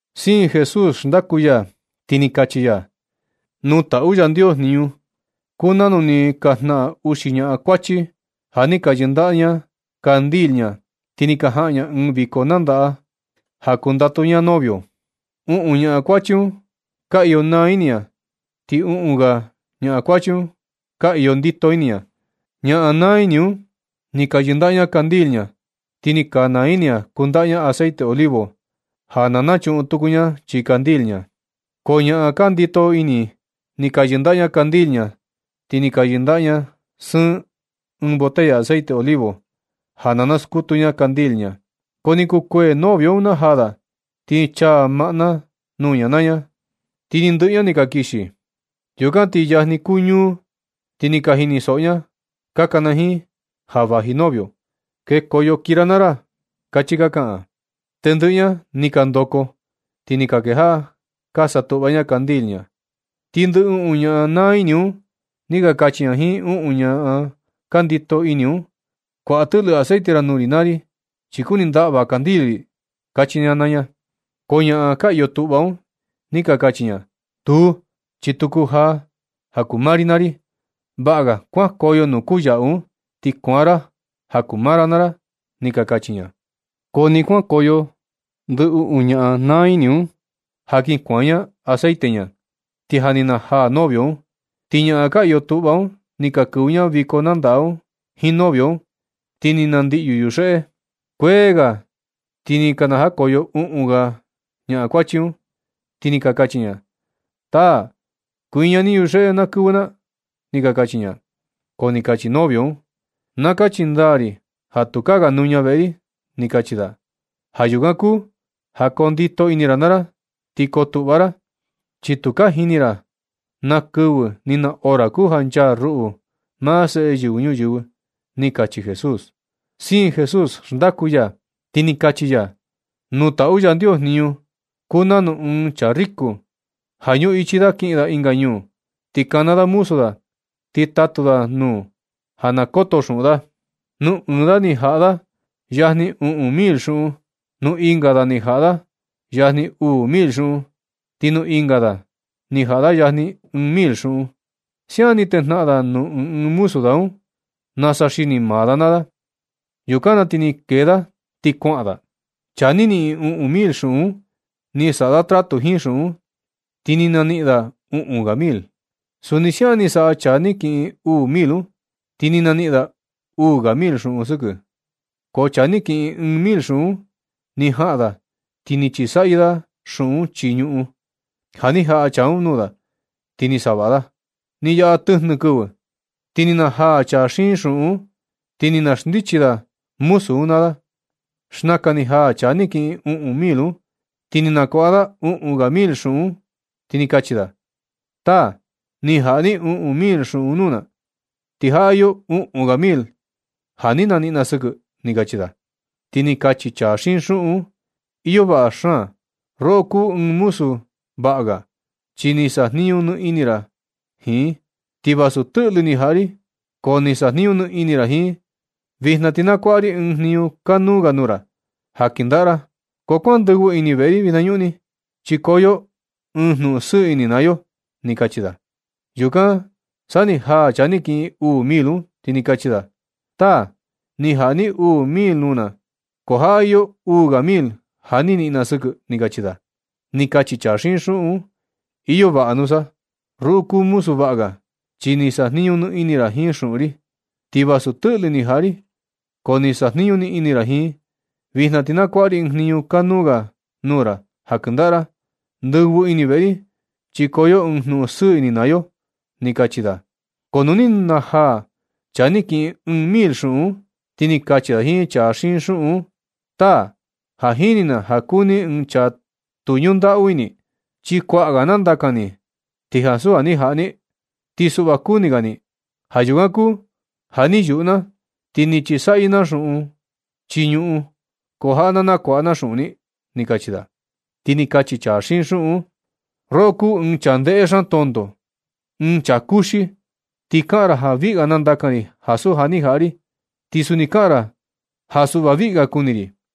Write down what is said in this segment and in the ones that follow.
Siin Jesús xndaku ya, ti ni kachi ya: ―Nuu taꞌu Yandios jniñu kuu nanu ni ka jnaꞌan uxi ñaꞌan kuachi ja ka yɨndaꞌa ña candil ña, ti ni ka jaꞌan ña ɨɨn viko nandaꞌa ja kundatu ña novio. Uꞌun ñaa kuachi un ka iyo naa ini ña, ti uꞌun ga ña kuachi un ka iyo ndito ini ña. Ñaꞌan naa ini un, ni ka yɨndaꞌa ña candil ña, ti ni ka naa ini ña kundaꞌa ña aceite olivo ja na nachuꞌun tuku ña chii candil ña. Ko ñaꞌan ka ñundito ini, ni ka yɨndaꞌa ña candil ña, ti ni ka yɨndaꞌa sɨɨn ña botella aceite olivo ja na naskutu ña candil ña. Ko ni kukuee novio un najaa da, ti ni chaa maꞌna nuu ña naa ña, ti ni ndɨꞌɨ ña ni ka kixi. Yukan ti yajni kuu ñuu, ti ni ka jinisoꞌo ña ka kana jiin: “¡Ja vaji novio, kekoyo kii ra naa ra”! ―kachi ka kaꞌan. Tendɨꞌɨ ña ni ka ndoko ti ni ka kejaꞌa ka satuꞌva ña candil ña. Ti ndɨ uꞌun ñaꞌan naa ini un ni ka kachi ña jiin uꞌun ga ñaꞌan ka ñundito ini un: “Kuaꞌa tɨꞌlɨ aceite ra nuu ri naa ri, chi kuni ndaꞌva candil ri”, kachi ña naa ña. Ko ñaꞌan ka iyo tuꞌva un, ni ka kachi ña: “Tuu, chi tu kujaa ja kuu maa ri naa ri. Vaꞌa ga kuankoyo nuu kuyaꞌu un, ti kuaan ra ja kuu maa ra naa ra”, ni ka kachi ña. Ko nɨ kuankoyo ndɨ uꞌun ñaꞌan naa ini un, ja kin kuaan ña aceite ña, ti ja ni najaa novio un. Ti ñaꞌan ka iyo tuꞌva un ni ka kɨvɨ ña viko nandaꞌa un jiin novio un, ti ni nandiꞌyu yuxeꞌe. Kuee ga ti ni ka najakoyo uꞌun ga ñaꞌan kuachi un, ti ni ka kachi ña: “Taa, kuiña ni yuxeꞌe na kɨvɨ na”, ni ka kachi ña. Ko ni kachi novio un: “Na kachi ndaa ri ja tukaa ga nuña veꞌe ri”, ni kachi da. Ja yukan kuu ja kondito ini ra naa ra, ti kotuꞌva ra, chi tu ka jini ra na kɨvɨ, ni na hora kuu ja nchaa ruꞌu, maa Seꞌe Yɨvɨ Ñuyɨvɨ ―ni kachi Jesús. Siin Jesús xndaku ya, ti ni kachi ya: ―Nuu taꞌu Yandios jniñu kuu nanu ɨɨn chaa riku, ja ñuꞌichi da kiꞌin da ɨnga ñuu. Ni kana da muzu da ti ni tatu da nuu ja na koto xuꞌun da. Nuu ɨɨn da ni jaꞌa da yajni uꞌun mil xuꞌun. Nuu ɨnga da ni jaꞌa da yajni uu mil xuꞌun, ti nuu ɨnga da ni jaꞌa da yajni ɨɨn mil xuꞌun. Siaꞌan ni tejnaꞌan da nuu ɨɨn ɨɨn muzu da un nasa xini maa da naa da. Yukan na ti ni kee da ti kuaꞌan da. Chaa ni niꞌin uꞌun mil xuꞌun un, ni saꞌa da tratu jiin xuꞌun un, ti ni naniꞌin da uꞌun ga mil. Suni siaꞌan ni saꞌa chaa ni kiꞌin uu mil un, ti ni naniꞌin da uu mil ga xuꞌun sɨkɨ. Ko chaa ni kiꞌin ɨɨn mil xuꞌun un, ni jaꞌan da ti ni chisaꞌyɨ da xuꞌun un chii ñuꞌun, ja ni jaꞌa chaa un nuu da ti ni savaꞌa da. Ni yaꞌa tɨjnɨ kɨvɨ, ti ni najaa chaa xiin xuꞌun un, ti ni na xndichi da muzu un naa da. Xnaka ni jaa chaa ni kiꞌin uꞌun mil un, ti ni nakuaꞌa da uꞌun ga mil xuꞌun un, ti ni kachi da: “Taa, ni jaꞌa ni uꞌun mil xuꞌun nuu na, ti jaꞌa iyo uꞌun ga mil ja ni niꞌin na sɨkɨ”, ni kachi da. Ti ni kachi chaa xiin xuꞌun un: “Iyo vaꞌa xaan, roꞌo kuu ɨɨn muzu vaꞌa ga, chi ni sajniñu ni ini ra jiin, ti vasu tɨꞌlɨ ni jaꞌa ri ko ni sajniñu ni ini ra jiin. Vijna ti nakuaꞌa ri ɨɨn jniñu kanuu ga nuu ra ja kɨndaꞌa ra. Ko kuan ndɨvɨ ini veꞌe ri vinañuꞌni, chi koo yo ɨɨn jnuꞌun sɨɨ ini naa yo”, ni kachi da. Yukan sa ni jaa chaa ni kiꞌin uu mil un, ti ni kachi da: “Taa, ni jaꞌa ni uu mil nuu na, ko jaꞌa iyo uu ga mil ja ni niꞌin na sɨkɨ”, ni kachi da. Ni kachi chaa xiin xuꞌun un: “Iyo vaꞌa nusa. Roꞌo kuu muzu vaꞌa ga, chi ni sajniñu ni ini ra jiin xuꞌun ri, ti vasu tɨꞌlɨ ni jaꞌa ri, ko ni sajniñu ni ini ra jiin. Vijna ti nakuaꞌa ri ɨɨn jniñu kanuu ga nuu ra ja kɨndaꞌa ra. Ndɨvɨ ini veꞌe ri, chi koo yo ɨɨn jnuꞌun sɨɨ ini naa yo”, ni kachi da. Ko nu ni jaa chaa ni kiꞌin ɨɨn mil xuꞌun un, ti ni kachi da jiin chaa xiin xuꞌun un: “Taa, ja jini na ja kuu ni chaa tu ñundaꞌu ini, chi kuaꞌa ga nandakan ni ti ansu ja ni jaꞌa ni, ti suꞌva kuni ga ni. Ja yukan kuu ja ni yuꞌu na ti ni chisaꞌyɨ na xuꞌun un chii ñuꞌun, ko jaꞌa na nakuaꞌa na xuꞌun ni”, ni kachi da. Ti ni kachi chaa xiin xuꞌun un: “Roꞌo kuu ɨɨn chaa ndéhé xaan tonto, ɨɨn chaa kuxi. Ti kaꞌan ra ja viꞌi ga nandakan ri ansu ja ni jaꞌa ri, ti suni kaꞌan ra ja suꞌva viꞌi ga kuni ri.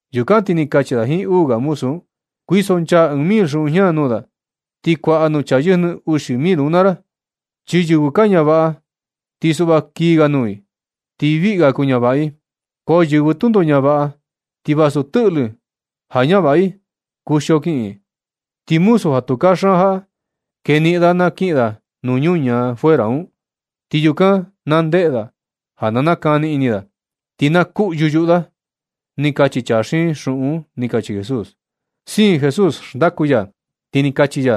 Yukan ti ni kachi da jiin uu ga muzu un: “Kuisonchaa ɨɨn mil xuꞌun jña nuu da, ti kuaꞌa nuu chaa yɨjnɨ uxi mil un naa ra. Chi yɨvɨ ka ñavaꞌa, ti suꞌva kii ga nuu i, ti viꞌi ga kuñavaꞌa i. Ko yɨvɨ tundo ñavaꞌa, ti vasu tɨꞌlɨ ja ñavaꞌa i un, kuxio kiꞌin. Ti muzu ja tu kaxaan jaꞌa, keniꞌin da na kiꞌin da nuu ñuu ñaa fuera un. Ti yukan na ndeꞌe da ja na nakani ini da, ti na kuꞌyu yuꞌu da”, ni kachi chaa xiin xuꞌun un ―ni kachi Jesús. Siin Jesús xndaku ya, ti ni kachi ya: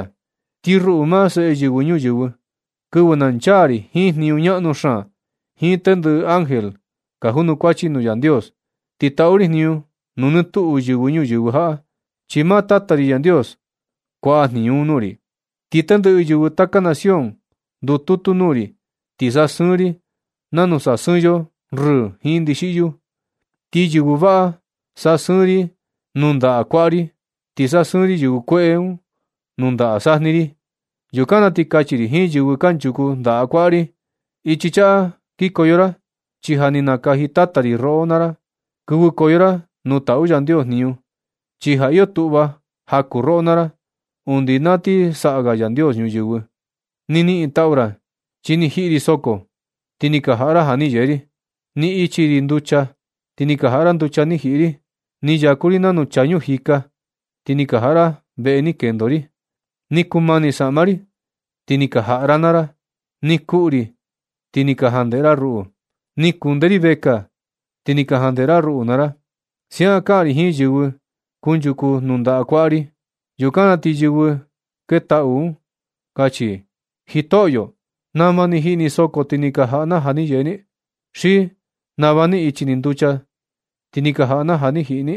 ―Ti ruꞌu, maa Seꞌe Yɨvɨ Ñuyɨɨ, kɨvɨ na nchaa ri jiin jniñu ñaꞌnu xaan, jiin tendɨꞌɨ ángel ka junukuachi nuu Yandios, ti taꞌu ri jniñu nuu nɨ tuꞌu yɨvɨ ñuyɨvɨ jaꞌa, chi maa Tata ri Yandios kuaꞌa jniñu un nuu ri. Ti tendɨꞌɨ yɨvɨ taka nación ndututu nuu ri, ti sasɨɨn ri i nanu sasɨɨn yo rɨɨ jiin ndixiꞌyu. Ti yɨvɨ vaꞌa sasɨɨn ri i nundaꞌa kuaꞌa ri. Ti sasɨɨn ri yɨvɨ kueꞌe un nundaꞌa sajni ri. Yukan na ti kachi ri jiin yɨvɨ kanchuku ndaꞌa kuaꞌa ri: “Ichi chaꞌa kikoyo ra, chi ja ni nakaji Tata ri roꞌo naa ra. Kɨvɨkoyo ra nuu taꞌu Yandios jniñu, chi ja iyo tuꞌva ja kuu roꞌo naa ra undi na ni saꞌa Yandios ñuyɨvɨ. Ni niꞌin taꞌu ra, chi ni jiꞌi ri soko, ti ni ka jaꞌa ra ja ni yee ri. Ni ichi ri nducha, ti ni ka jaꞌa ra nducha ni jiꞌi ri. Ni yaku ri nanu chaa ñuu jika, ti ni ka jaꞌa ra veꞌe ni kendo ri. Ni kumani saꞌma ri, ti ni ka jaꞌa ra naa ra. Ni kuꞌu ri, ti ni ka jandeꞌe ra ruꞌu. Ni kunde ri vekaa, ti ni ka jandeꞌe ra ruꞌu naa ra.” Siaꞌan kaꞌan ri jiin yɨvɨ kunchuku nundaꞌa kuaꞌa ri. Yukan na ti yɨvɨ ni ketaꞌu un kachi i: “Jitoꞌyo, ¿nama ni jiꞌi ni soko, ti ni ka jaꞌa na ja ni yee ni? ¿Xi nama ni ichi ni nducha, ti ni ka jaꞌa na ja ni jiꞌi ni?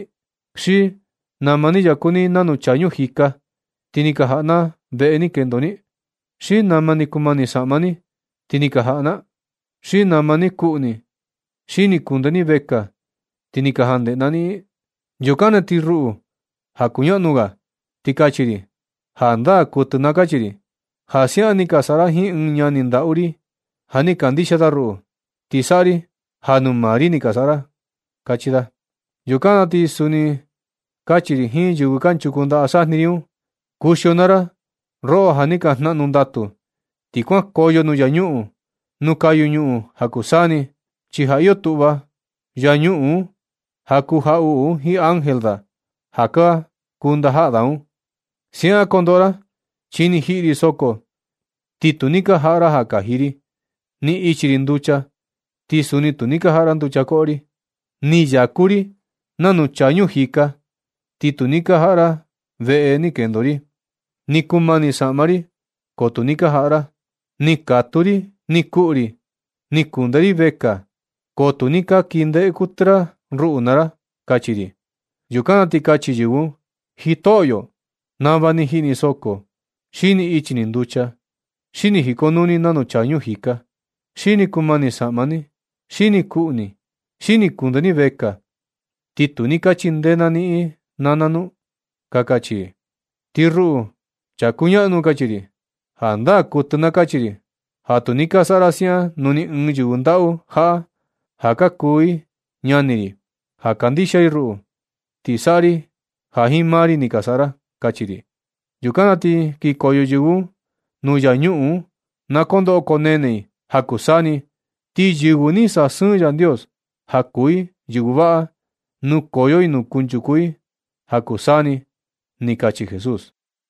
¿Xi nama ni yaku ni nanu chaa ñuu jika, ti ni ka jaꞌa na veꞌe ni kendo ni? ¿Xi nama ni kumani saꞌma ni, ti ni ka jaꞌa na? ¿Xi nama ni kuꞌu ni xi ni kundee ni vekaa, ti ni ka jandeꞌe na niꞌin?” Yukan na ti ruꞌu, ja kuñaꞌnu ga, ti kachi ri: “Jandaa kuɨtɨ na kachi ri, ja siaꞌan ni ka saꞌa ra jiin ɨɨn ñani ndaꞌu ri ja ni kandixia da ruꞌu, ti saꞌa ri ja nuu maa ri ni ka saꞌa ra”, kachi da. Yukan na ti suni kachi ri jiin yɨvɨ kanchuku ndaꞌa sajni ri un: “Kuxio naa ra, roꞌo ja ni ka jnaꞌnu ndatu, ti kuankoyo nuu infiernu un, nuu kayu ñuꞌun ja kuu saa ni, chi ja iyo tuꞌva infiernu un ja kuu jaꞌuꞌu un jiin ángel da ja ka kuu ndajaꞌa da un. Siaꞌan kondoꞌo ra, chi ni jiꞌi ri soko, ti tu ni ka jaꞌa ra ja kaji ri. Ni ichi ri nducha, ti suni tu ni ka jaꞌa ra nducha koꞌo ri. Ni yaku ri nanu chaa ñuu jika, ti tu ni ka jaꞌa nuu ra veꞌe kendo ri. Ni kumani i saꞌma ri, ko tu ni ka jaꞌa ra. Ni katuu ri ni kuꞌu ri, ni kunde ri vekaa, ko tu ni ka kii ndeꞌe kuɨtɨ ra ruꞌu naa ra”, kachi ri. Yukan na ti kachi yɨvɨ un: “Jitoꞌyo, ¿nama ni jiꞌi ni soko, xi ni ichi ni nducha, xi ni jikonuu ni nanu chaa ñuu jika, xi ni kumani saꞌma ni, xi ni kuꞌu ni, xi ni kunde ni vekaa, ti tu ni ka chindee na niꞌin naa na nu”? ka kachi i. Ti ruꞌu, chaa kuñaꞌnu kachi ri: “Jandaa kuɨtɨ na kachi ri ja tu ni ka saꞌa ra siaꞌan nuu ɨɨn yɨvɨ ndaꞌu jaꞌa ja ka kuu i ñani ri, ja kandixia i ruꞌu, ti saꞌa ri ja jiin maa ri ni ka saꞌa ra”, kachi ri. Yukan na ti kinkoyo yɨvɨ un nuu infiernu naa kondoꞌo koo nene i ja kuu saa ni. Ti yɨvɨ ni sasɨɨn Yandios ja kuu i yɨvɨ vaꞌa, nukoyo i nuu kuchaku i ja kuu saa ni ―ni kachi Jesús.